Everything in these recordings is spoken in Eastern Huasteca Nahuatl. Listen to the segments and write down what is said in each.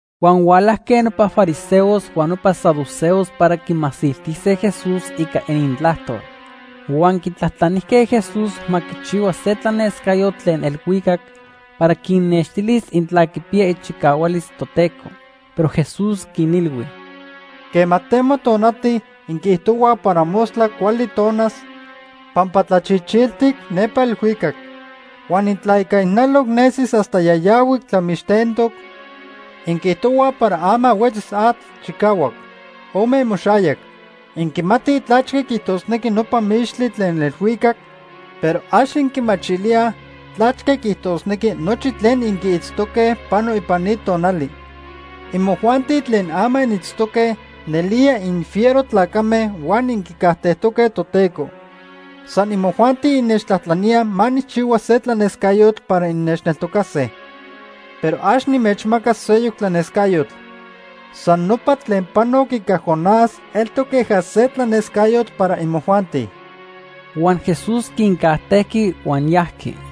Huan hualajque nopa fariseos huan nopa saduceos para quimasiltise Jesús ica inintlajtol. Huan quitlajtlanijque Jesús ma quichihua se tlanescayotl tlen elhuicac para quinnextilis intla quipiya ichicahualis Toteco. Pero Jesús quinilhui: “Quema temo tonati inquiijtohuaj para mostla cuali tonas pampa tlachichiltic nepa elhuicac. Huan intla ica ijnaloc nesi hasta yayahuic tlamixtentoc, inquiijtohuaj para ama huetzis atl chicahuac. ¡Ome imoxayac! Inquimatij tlachque quiijtosnequi nopa mixtli tlen elhuicac, pero ax inquimachilíaj tlachque quiijtosnequi nochi tlen inquiitztoque pano ipan ni tonali. Imojuanti tlen ama initztoque nelía infiero tlacame huan inquicajtejtoque Toteco. San imojuanti innechtlajtlaníaj ma nijchihua se tlanescayotl para innechneltocase. Pero ax nimechmacas seyoc tlanescayotl. San nopa tlen panoc ica Jonás eltoc queja se tlanescayotl para imojuanti.” Huan Jesús quincajtejqui huan yajqui.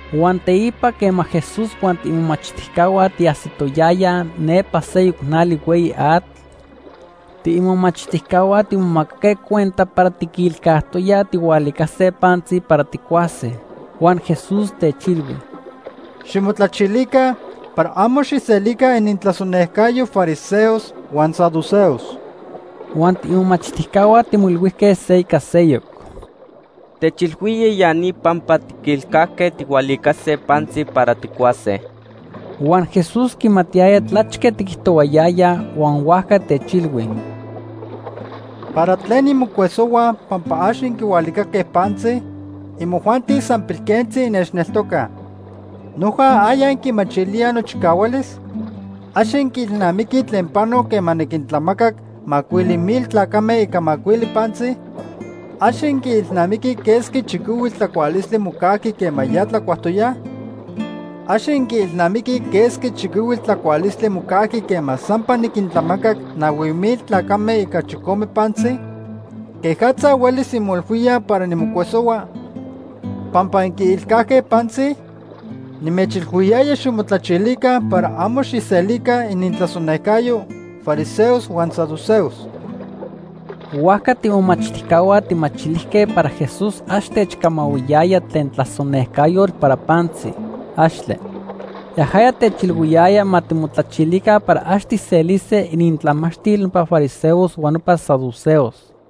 Huan teipa quema Jesús huan tiimomachtijcahua tiajsitoyajya nepa seyoc nali hueyi atl, tiimomachtijcahua timomacaque cuenta para tiquilcajtoyaj tijhualicase pantzi para tijcuase. Huan Jesús techilhui: ―Ximotlachilica para amo xijselica inintlasonejcayo fariseos huan saduceos. Huan tiimomachtijcahua timoilhuijque se ica seyoc: ―Techilhuía ya ni pampa tiquilcajque tijhualicase pantzi para tijcuase. Huan Jesús quimatiyaya tlachque tiquijtohuayayaj huan huajca techilhui: ―¿Para tlen inmocuesohuaj pampa ax inquihualicaque pantzi? Imojuanti san pilquentzi innechneltocaj. ¿Noja aya inquimachilíaj nochicahualis? ¿Ax inquiilnamiquij tlen panoc quema niquintlamacac macuili mil tlacame ica macuili pantzi? ¿Ax inquiilnamiquij quesqui chiquihuitl tlacualistli mocajqui quema ya tlacuajtoyaj? ¿Ax inquiilnamiquij quesqui chiquihuitl tlacualistli mocajqui quema sampa niquintlamacac nahui mil tlacame ica chicome pantzi? ¿Quejatza huelis inmoilhuíaj para nimocuesohua pampa inquiilcajque pantzi? Nimechilhuiyaya ximotlachilica para amo xijselica inintlasonejcayo fariseos huan saduceos. Huajca tiimomachtijcahua tijmachilijque para Jesús ax techcamahuiyaya tlen tlasonejcayotl para pantzi. ¡Axtle! Yajaya techilhuiyaya ma timotlachilica para ax tijselise inintlamachtil nopa fariseos huan nopa saduceos.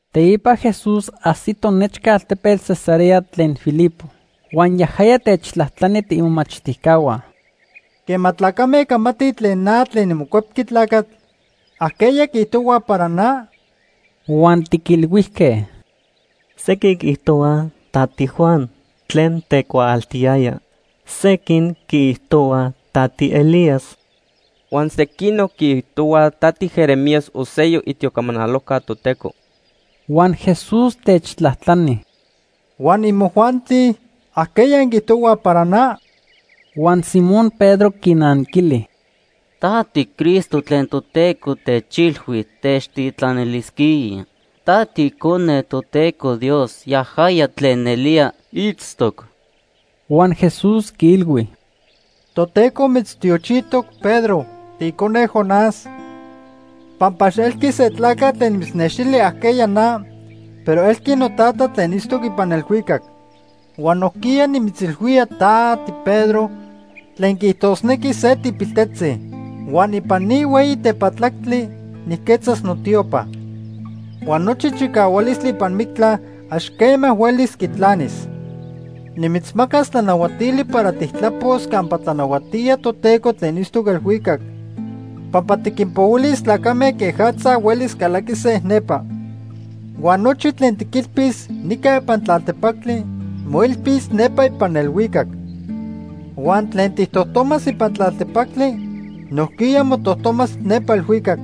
Teipa Jesús ajsito nechca altepetl Cesarea de Filipo. Huan yajaya techtlajtlani tiimomachtijcahua: ―Quema tlacame camatij tlen na tlen niMocuepqui Tlacatl, ¿ajqueya quiijtohuaj para na? Huan tiquilhuijque: ―Sequin quiijtohuaj ta tiJuan tlen tecuaaltiyaya. Sequin quiijtohuaj ta tiElías. Huan sequinoc quiijtohuaj ta tiJeremías o seyoc itiocamanalojca Toteco. Huan Jesús techtlajtlani: ―¿Huan imojuanti? ¿Ajqueya inquiijtohuaj para na? Huan Simón Pedro quinanquili: ―Ta tiCristo tlen Toteco techilhui techtitlanilisquía. Ta tiIcone Toteco Dios, yajaya tlen nelía itztoc. Huan Jesús quiilhui: ―Toteco mitztiochijtoc Pedro, tiicone Jonás, pampa ax elqui se tlacatl tlen mitznextili ajqueya na, pero elqui noTata tlen itztoc ipan elhuicac. Huan nojquiya nimitzilhuía ta, tiPedro, tlen quiijtosnequi se tipiltetzi. Huan ipan ni hueyi tepatlactli nijquetzas notiopa. Huan nochi chicahualistli ipan mictla ax quema huelis quitlanis. Nimitzmacas tlanahuatili para tijtlapos campa tlanahuatía Toteco tlen itztoc elhuicac, pampa tiquinpohuilis tlacame quejatza huelis calaquise nepa. Huan nochi tlen tiquilpis nica ipan tlaltepactli, moilpis nepa ipan elhuicac. Huan tlen tijtojtomas ipan tlaltepactli, nojquiya motojtomas nepa elhuicac.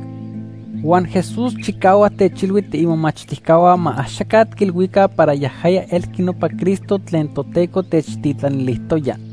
Huan Jesús chicahuac techilhui tiimomachtijcahua ma axaca tiquilhuica para yajaya elqui nopa Cristo tlen Toteco techtitlanilijtoya.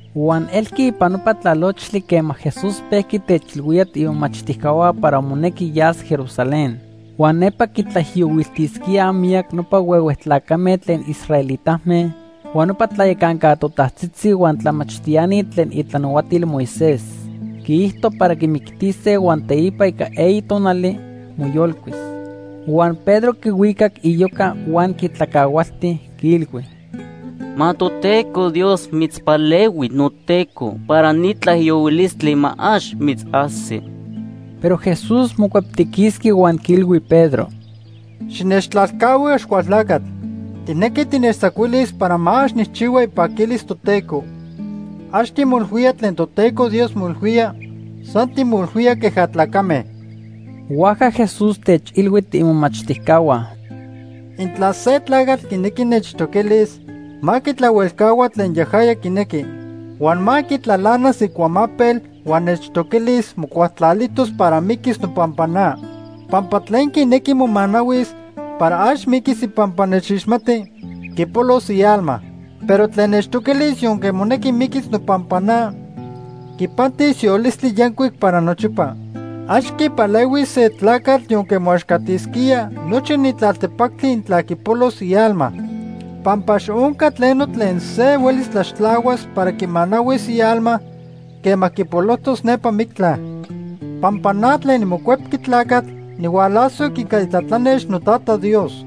Huan elqui ipan nopa tlalochtli quema Jesús pejqui techilhuía tiimomachtijcahua para monequi yas Jerusalén. Huan nepa quitlaijiyohuiltisquíaj miyac nopa huehue tlacame tlen israelitame, huan nopa tlayacanca totajtzitzi huan tlamachtiani tlen itlanahuatil Moisés. Quiijto para quimictise huan teipa ica eyi tonali, moyolcuis. Huan Pedro quihuicac iyoca huan quitlacahualti, quiilhui: ―Ma Toteco Dios mitzpalehui, noTeco, para ni tlaijiyohuilistli ma ax mitzajsi. Pero Jesús mocueptiquisqui huan quiilhui Pedro: ―Xinechtlalcahui, Axcualtlacatl. Tijnequi tinechtzacuilis para ma ax nijchihua ipaquilis Toteco. Ax timoilhuía tlen Toteco Dios moilhuía, san timoilhuía queja tlacame. Huajca Jesús techilhui tiimomachtijcahua: ―Intla se tlacatl quinequi nechtoquilis, ma quitlahuelcahua tlen yajaya quinequi. Huan ma quitlalanas icuamapel huan nechtoquilis mocualtlalijtos para miquis nopampa na. Pampa tlen quinequi momanahuis para ax miquis ipampa nechixmati, quipolos ialma. Pero tlen nechtoquilis yonque monequi miquis nopampa na, quipantis yolistli yancuic para nochipa. Ax quipalehuis se tlacatl yonque moaxcatisquía nochi ni tlaltepactli intla quipolos ialma. Pampa ax onca tleno tlen se huelis tlaxtlahuas para quimanahuis ialma quema quipolojtos nepa mictla. Pampa na tlen niMocuepqui Tlacatl nihualasoc ica itlatlanex noTata Dios.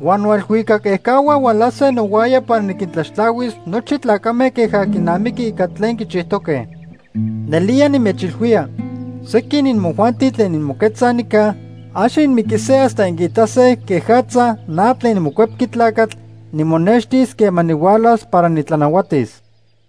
Huan noelhuicac ejcahua hualase nohuaya para niquintlaxtlahuis nochi tlacame queja quinamiqui ica tlen quichijtoque. Nelía nimechilhuía, sequin imojuanti tlen inmoquetzaj nica, ax inmiquise hasta inquiitase quejatza na tlen niMocuepqui Tlacatl nimonextis quema nihualas para nitlanahuatis.